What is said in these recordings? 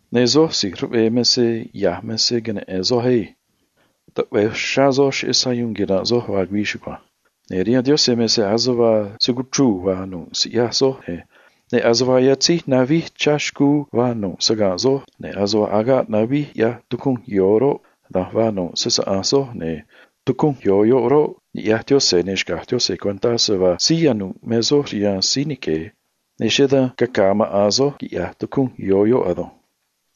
Ne̱ soj si̱j ruꞌvee me se ya̱j me se cuno̱ soj á. Taꞌve̱e cagua̱j uxrá soj cheꞌé sayuun quira̱nꞌ soj vaa güii chugua̱nj. Ne̱ rihaan Yaꞌanj me se ase vaa se cuchruu̱ vaa nu̱ꞌ siꞌyaj soj, ne̱ ase vaa yatzíj navij chá xcuu vaa nu̱ꞌ saga̱nꞌ soj, ne̱ ase vaa agaꞌ navij quiꞌyaj tucunj yo̱o roꞌ, da̱nj vaa nu̱ꞌ se‑saꞌa̱nj soj, ne̱ tucunj yo̱o yoꞌ roꞌ, ni̱ꞌyaj Yaꞌanj, ne̱ xca̱j Yaꞌanj cuentá se vaa síí yanu̱ꞌ me soj rihaan síí nique̱, ne̱ cheꞌé dan caca̱a̱ maꞌa̱n soj, quiꞌya̱j tucunj yo̱o yoꞌ ado̱nj.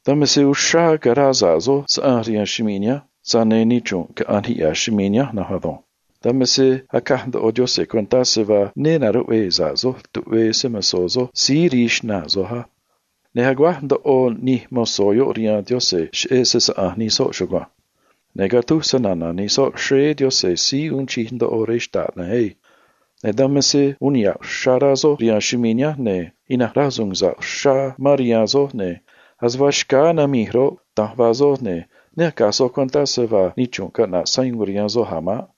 Dan me se uxrá caraa sa̱ꞌ soj saꞌanj rihaan chumii̱ nihánj, tza̱j ne̱ nichrunꞌ caꞌa̱nj niꞌya̱ chumii̱ nihánj na̱nj ado̱nj. Xca̱j soj cuentá á. Ne na̱ruꞌvee soj tuꞌvee se‑mo̱zó soj síí rii xnaa̱ soj, ne̱ aguáj ndoꞌo nij mozó yoꞌ achíín niꞌya̱j nij soꞌ rihaan Yaꞌanj cheꞌé se‑saꞌa̱nj nij soꞌ chugua̱nj. Ne̱ catúj snana̱ nij soꞌ xréé Yaꞌanj si̱j uun chij ndoꞌo rej xta̱ꞌ na̱nj á. Ne̱ dan me se uun niha̱ꞌ uxrá rá soj rihaan chumii̱ nihánj, ne̱ ina̱nj rasu̱u̱n sa̱ꞌ uxrá mán rihaan soj, ne̱ ase vaa xcáá namij roꞌ, da̱nj vaa soj, ne̱ ne acaj soj cuentá se vaa nichrunꞌ caꞌna̱ꞌ sayuun rihaan soj a̱ maꞌ.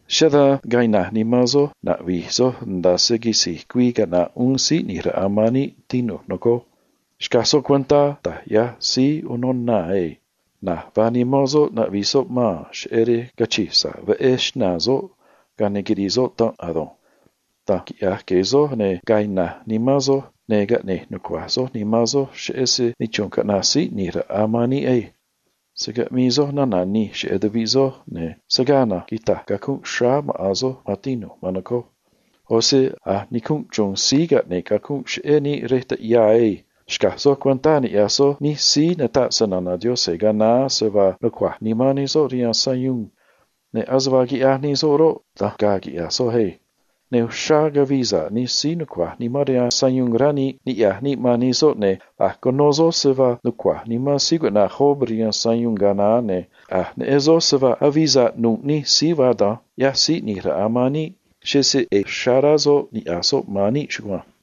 Cheꞌé dan ga̱a̱ ina̱j nimán soj na̱ꞌvi̱j soj nda̱a se quisi̱j güii caꞌna̱ꞌ uún Síí ꞌNi̱j Raꞌa man níꞌ, tinu̱j, nocoj. Xca̱j soj cuentá da̱j ꞌyaj síí unô naa̱ á. Na̱j vaa nimán soꞌ naꞌvi̱j soꞌ maa̱n cheꞌé rej cachi̱j sa̱ꞌ veꞌé xnaa̱ soꞌ, ga̱a ne̱ quiri̱i̱ soꞌ xnaa̱ soꞌ ado̱nj. Da̱nj quiꞌya̱j gue̱e̱ soj, ne̱ ga̱a̱ ina̱j nimán soj, ne̱ caꞌne̱j nucua̱j soj nimán soj, cheꞌé se nichrunꞌ caꞌna̱ꞌ uún Síí ꞌNi̱j Raꞌa man níꞌ ado̱nj. Se̱ caꞌmii soj nana̱ nij cheꞌé tuviꞌ soj, ga̱a ne̱ se̱ gaa na̱nj quita̱j cacunꞌ xráá maꞌa̱n soj, maan tinu̱j, maan nocoj. ꞌO̱ se a̱j nicunꞌ chru̱u̱n síí caꞌne̱ꞌ cacunꞌ cheꞌé níꞌ rej taꞌyaa na̱nj ado̱nj. Xca̱j soj cuentá, ni̱ꞌyaj soj nij síí nataꞌ snana̱ Yaꞌanj ga̱a naá se vaa nucua̱j nimán nij soꞌ rihaan sayuun, ne̱ ase vaa quiꞌyaj nij soꞌ roꞌ, da̱nj ga̱a̱ quiꞌya̱j soj á. Ne̱ uxrá cavii sa̱ꞌ nij síí nucua̱j nimán rihaan sayuun, rá níꞌ, niꞌya̱j níꞌ man nij soꞌ, ne̱ a̱j cuno soj se vaa nucua̱j nimán síí cuꞌna̱j Job rihaan sayuun ga̱a naá, ne̱ a̱j neꞌen soj se vaa avii sa̱ꞌ nu̱ꞌ nij síí vaa da̱nj, ꞌyaj Síí ꞌNi̱j Raꞌa man níꞌ, cheꞌé se ꞌe̱e̱ uxrá rá soꞌ niꞌya̱j soꞌ man níꞌ chugua̱nj.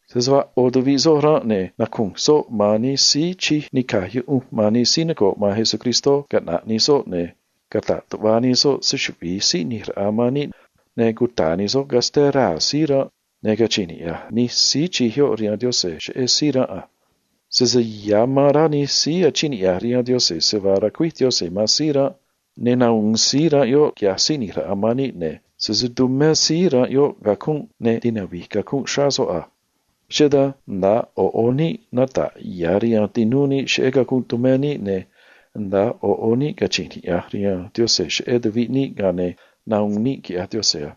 Sese vaa ꞌo̱ tuviꞌ soj ranꞌ, ne̱ nacu̱nj soꞌ man nij síí tumé sa̱ꞌ rihaan Yaꞌanj xꞌneꞌ nij síí noco̱ꞌ man Cristó caꞌna̱ꞌ nij soꞌ, ne̱ cata̱ꞌ tuꞌva nij soꞌ se‑chuvi̱i Síí ꞌNi̱j Raꞌa man níꞌ, ne̱ cuta̱a̱ nij soꞌ casté raa̱ síí ranꞌ, ne̱ cachi̱nj niꞌya̱j nij soꞌ rihaan Yaꞌanj cheꞌé síí ranꞌ a. Sese ya̱ amán rá nij síí achíín niꞌya̱j rihaan Yaꞌanj se vaa ra̱cuíj Yaꞌanj man síí ranꞌ, ne̱ nahu̱un síí ranꞌ yoꞌ, quiꞌya̱j Síí ꞌNi̱j Raꞌa man níꞌ, ne̱ sese tumé síí ranꞌ yoꞌ cacunꞌ, ne̱ navi̱j cacunꞌ xráá soꞌ a. Cheꞌé dan nda̱a ꞌo̱ ꞌo̱ níꞌ nata̱ꞌ ya̱ rihaan tinúú níꞌ cheꞌé cacunꞌ tumé níꞌ, ne̱ nda̱a ꞌo̱ ꞌo̱ níꞌ cachi̱nj niꞌya̱j rihaan Yaꞌanj cheꞌé tuviꞌ níꞌ, ga̱a ne̱ nahu̱un níꞌ, quiꞌya̱j Yaꞌanj a.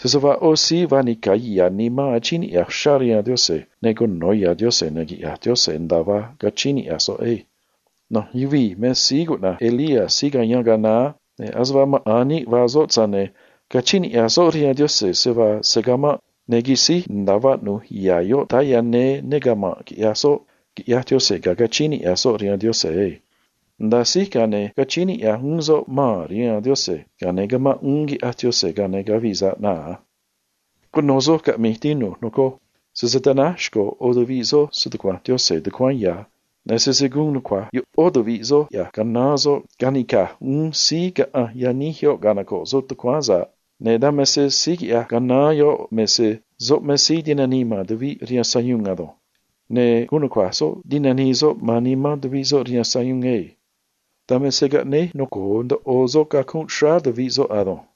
Sese vaa ꞌo̱ síí vaa nica̱ ya̱ nimán achíín niꞌya̱j uxrá rihaan Yaꞌanj, ne̱ cuno̱ ya̱ Yaꞌanj, ne̱ quiꞌya̱j Yaꞌanj nda̱a vaa cachíín niꞌya̱j soꞌ ado̱nj. Na̱nj yuvii̱ me síí cuꞌna̱j Elías síí cayáán ga̱a naá, ne̱ ase vaa maꞌa̱n níꞌ vaa soꞌ, tza̱j ne̱ cachíín niꞌya̱j soꞌ rihaan Yaꞌanj se vaa se̱ camanꞌ, ne̱ quisíj nda̱a vaꞌnu̱j ya̱ yoꞌ táá néé ne cama̱nꞌ quiꞌyaj soꞌ, quiꞌyaj Yaꞌanj ga̱a cachíín niꞌya̱j soꞌ rihaan Yaꞌanj maꞌ. Nda̱a síj, ga̱a ne̱ cachíín niꞌya̱j uún soꞌ maa̱n rihaan Yaꞌanj, ga̱a ne̱ camanꞌ uún, quiꞌyaj Yaꞌanj, ga̱a ne̱ cavii sa̱ꞌ naa̱ a. Cuno̱ soj caꞌmi̱j, tinu̱j, nocoj. Sese ta̱náj xco̱ ꞌo̱ tuviꞌ soj stucua̱nj Yaꞌanj tucuáán ya̱, ne̱ sese gu̱un nucua̱j ꞌó tuviꞌ soj quiꞌya̱j canaán soꞌ ca̱nica̱j uún síí caꞌanj yaníj yoꞌ canoco̱ꞌ soꞌ tucuáán sa̱ꞌ, ne̱ dan me se síí quiꞌya̱j canaán man tuviꞌ caꞌanj yaníj me se gu̱un nucua̱j soꞌ ti̱nanii soꞌ man nimán tuviꞌ soꞌ rihaan sayuun ado̱nj. Dan me se caꞌne̱e̱ noco̱o ndoꞌo soꞌ cacunꞌ xráá tuviꞌ soꞌ ado̱nj.